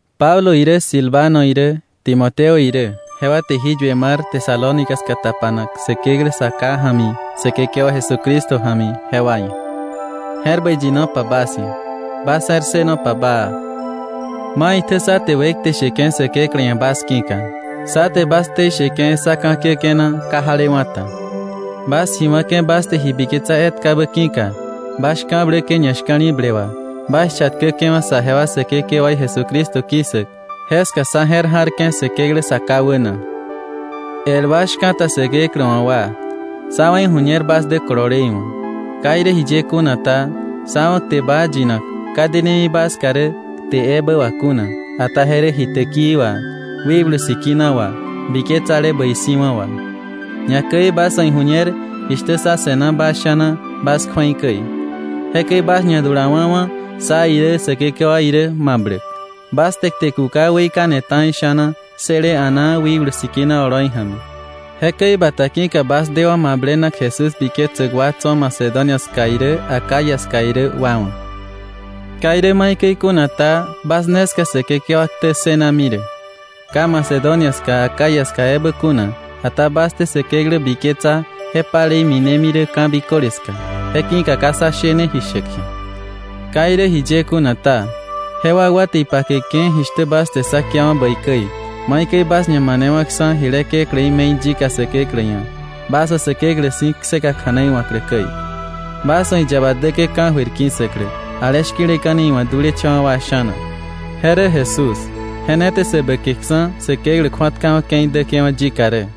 Pablo irä, Silvano irä, Timoteo irä, jewa te jí yue mar Tesalónica ska tapanak Säkeklä Sa Ká ja̱mi Säkekewa Jesucristo ja̱mi jewa ia̱. Je̱r bäi yinopa bas ia̱, bas je̱r ssënopa baa. Maitjä sá te wekte sheke̱ Säkeklä ia̱ bas ki̱ka; sá te bas ktei sheke̱ sá ka̱ kiäke̱ na ka jalewa̱ ta. Bas ji wa̱ke̱ bas te ji biketsa etkabä ki̱ka, bas shka̱bläke̱ ñashka̱li̱ble wà, bas chatkäke̱wa̱ saje wa Säkekewaí Jesucristo ki̱ssäk, jeska sá je̱r ja̱rke̱ Säkeklä Sa Ká wäna. El wa shka̱ta Säkeklä wa̱ wa, sá wa̱ iju̱ñer bas dä kolole iwa̱. Ka irä jiye kuna ta, sá wa̱ kte baa yinak, ka denemi bas ska rä kte ebä wà kuna ata je rä ji täkii wà, Wikblu Sikina wà, biketsale bäi si̱wa̱ wà. Ñakäi bas wa̱ iju̱ñer jishtä sá se̱na bas sha̱na bas kju̱ei käi. Jekäi bas ñadulawa̱wa̱ sá irä Säkekewa irä mabläk. Bas te kte kuka weikane ta̱i sha̱na ssële a̱naa Wikblu Sikina oloi ja̱mi. Jekäi bata ki̱ka bas dewa̱ mablenak Jesús biketsäk wa tso̱ Macedonia ska irä Acaya ska irä wa wa̱. Ka irä maikäi kuna ta, bas ne ska Säkekewa ktä ssënami rä, ka Macedonia ska Acaya ska ebä kuna, ata bas te Säkeklä biketsa, je palei minemi rä ka̱ biköle ska. Je ki̱ka ka sá shene ji shäk ji̱a. Ka irä jiye kuna ta, je wakwa te ipakeke̱ jishtä bas te sá kiawa̱ bäi käi, maikäi bas ñamanewa̱ksa̱ jile kekläí me̱i yika Säkeklä ia̱, bas wa̱ Säkeklä si̱ kseka kja̱nei wa̱klä käi, bas wa̱ iyaba däke̱ ka̱jöir ki̱ssäklä, ale shki̱leka̱ni iwa̱ dulecha̱wa̱ wa sha̱na. Je rä Jesús, je ne te sä bäkeksa̱ Säkeklä kju̱atkawa̱ ke̱i däke̱wa̱ yika rä.